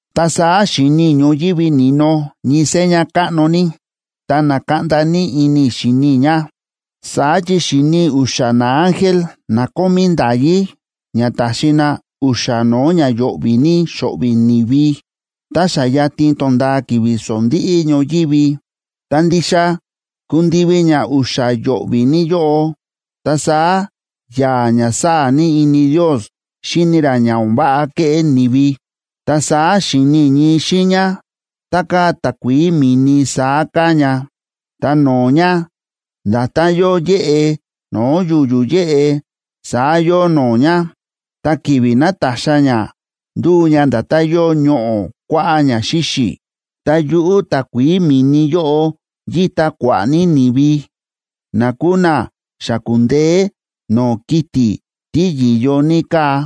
Ta saá xi̱ni i̱ ñoyívi ni̱no ñii seña káꞌno ní, ta na̱kaꞌnda ní ini i̱ xíni i̱ ña. Saá chi xi̱ni i̱ u̱xa̱ naángel na kómí nda̱yí ña taxi na u̱xa̱ no̱o̱ ña yo̱ꞌvi̱ ní xo̱ꞌvi̱ ni̱vi, tá xa yatin tonda̱a ki̱vi̱ sondíꞌí ñoyívi. Ta ndixa kundivi ña u̱xa̱ yo̱ꞌvi̱ ní yóꞌo, ta saá ya̱a̱ ña sáa̱ ní ini Ndios xíni ra ña o̱n váꞌa kéꞌé ni̱vi. Ta saá xi̱ni i̱ ñii xiiña, tá káa takuií mi̱ni saá káa ña, ta no̱o̱ ña, nda̱tán yóo yéꞌe no̱o̱ yu̱yu̱ yéꞌe, saá yóo no̱o̱ ña. Ta ki̱vi̱ nátaxa ña, ndúu ña nda̱tán yóo ñoꞌo̱ kuáꞌá ña xíxi̱. Ta yuꞌu̱ takuií mi̱ni yóꞌo yíta kua̱ꞌa̱ ní ni̱vi na kúu na xa ku̱ndeé no̱o̱ kiti̱ tí yi̱yo ní káa,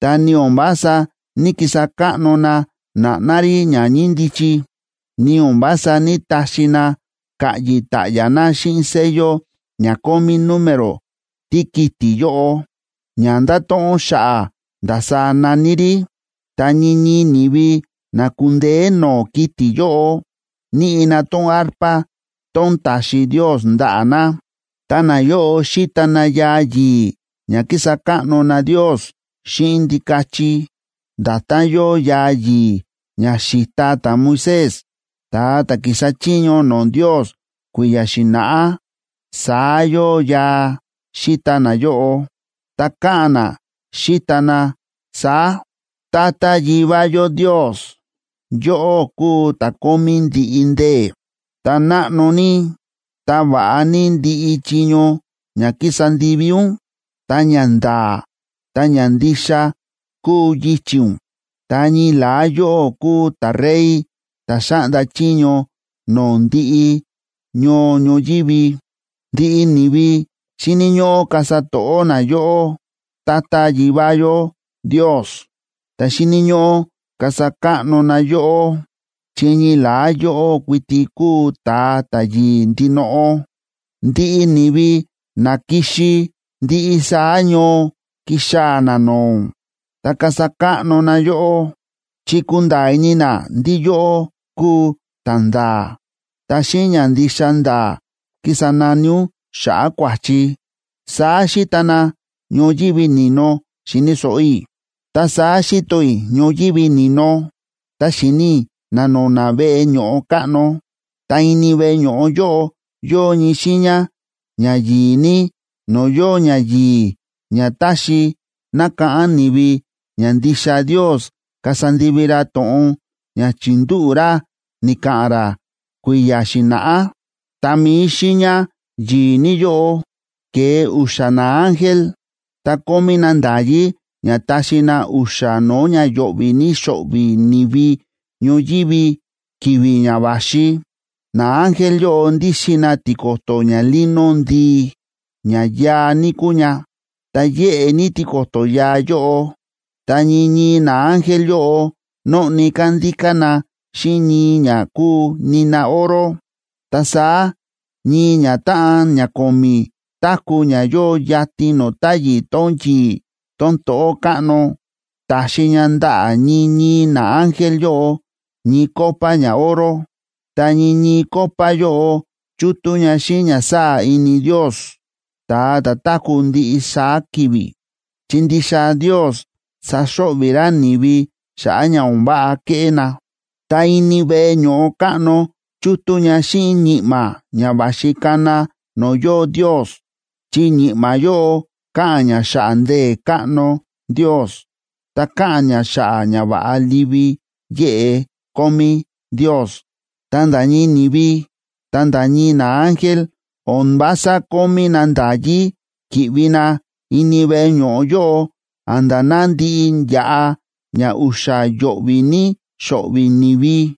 ta ni o̱n vása ní‑kisa káꞌno na na̱ꞌná rí ña ñíndichi, ni o̱n vása ní‑taxi na ka̱ꞌyi̱ ta̱ꞌya̱ na xíꞌin sello ña kómí número tíkiti̱ yóꞌo, ña ndáto̱ꞌon xa̱ꞌa̱ ndasaá na̱ní rí. Ta ñii ñii ni̱vi na ku̱ndeé no̱o̱ kiti̱ yóꞌo, níꞌi na tón arpa tón ta̱xi Ndios ndaꞌa̱ na. Ta nayóꞌo xíta na yaa yi̱i̱ ña kísa káꞌno na Ndios xíꞌin Ndikachi. Nda̱tán yóo yaa yi̱i̱ ña xi̱ta ta̱Moisés, ta̱a ta̱ ki̱sa chiño no̱o̱ Ndios kui̱ya̱ xi̱na̱ꞌá, saá yóo yaa xíta nayóꞌo, ta káꞌa̱n na, xíta na saá: Tata Yivá yó Ndios, yóꞌó kúu ta̱ kómí ndiꞌi ndee̱. Ta náꞌno ní, ta va̱ꞌa ní ndiꞌi chiño ña kísa ndivi ún. Ta ña nda̱a̱ ta ña ndixa kúu yichi̱ ún. Ta ñii la̱á yóꞌó kúu ta̱Rey ta̱ xáꞌnda chiño no̱o̱ ndiꞌi ñoo ñoyívi. Ndiꞌi ni̱vi xíni̱ ñóꞌó kasa to̱ꞌó na yóꞌó, Tata Yivá yó Ndios, ta xíni̱ ñóꞌó kasa káꞌno na yóꞌó, chi ñii la̱á yóꞌó kuiti kúu ta̱a ta̱yi̱i̱ ndinoꞌo. Ndiꞌi ni̱vi na ki̱xi ndiꞌi saá ñoo kixaa̱ na no̱o̱ ún, ta kasa káꞌno na yóꞌó, chi kunda̱a̱ ini na ndí yóꞌó kúu ta̱nda̱a̱, ta xíꞌin ña ndixa nda̱a̱ kísa nani ún xa̱ꞌa̱ kua̱chi, saá xíta na ñoyívi ni̱no, xi̱ni̱ so̱ꞌo i̱. Ta saá xi̱to i̱ ñoyívi ni̱no, ta xi̱ni i̱ na̱no̱na̱ veꞌe ño̱ꞌo káꞌno. Ta ini veꞌe ño̱ꞌo yóꞌo yóo ñii xiiña ña yi̱i̱ ní no̱o̱ yóo ñayi̱i̱ ña táxi nakáꞌán ni̱vi ña ndixa Ndios kasa ndivi ra to̱ꞌon ña chi̱ndúꞌu̱ ra ni̱ka̱ꞌa̱n ra kui̱ya̱ xi̱na̱ꞌá. Ta mi̱i xiiña yi̱i̱ ní yóꞌo, ke̱e u̱xa̱ naángel. Ta kómí na nda̱yí ña taxi na u̱xa̱ no̱o̱ ña yo̱ꞌvi̱ ní xo̱ꞌvi̱ ni̱vi ñoyívi ki̱vi̱ ña va̱xi. Naángel yóꞌo ndíxin na tiko̱to̱ ñalino ndii, ña yaa ní kúu ña, ta yéꞌe ní tiko̱to̱ yaa yóꞌo. Ta ñii ñii naángel yóꞌo nóꞌni kándíká na xíꞌin ñii ña kúu nina oro. Ta saá ñii ñatáꞌan ña ko̱mi̱ táku̱ ña yóo yatin no̱o̱ táyi̱ tón yi̱i̱ tón to̱ꞌó káꞌno, ta̱xi ña ndaꞌa̱ ñii ñii naángel yóꞌo ñii copa ñaoro. Ta ñii ñii copa yóꞌo chútú ña xíꞌin ña sáa̱ ini Ndios, ta̱a ta̱ táku̱ ndiꞌi saá ki̱vi̱, chi ndixa Ndios saxo̱ꞌvi̱ ra ni̱vi xa̱ꞌa̱ ña o̱n váꞌa kéꞌé na. Ta ini veꞌe ño̱ꞌo káꞌno chútú ña xíꞌin ñi̱ꞌma̱ ña va̱xi kana no̱o̱ yóo Ndios. Chi ñi̱ꞌma̱ yóꞌo káꞌa̱n ña xa̱ꞌa̱ ndee̱ káꞌno Ndios, ta káꞌa̱n ña xa̱ꞌa̱ ñava̱ꞌa livi yéꞌe kómí Ndios. Ta nda̱ ñii ni̱vi, ta nda̱ ñii naángel o̱n vása kómí na nda̱yí ki̱ꞌvi na ini veꞌe ño̱ꞌo yóꞌo a̱nda̱ ná ndiꞌi yaꞌa ña u̱xa̱ yo̱ꞌvi̱ ní xo̱ꞌvi̱ ni̱vi.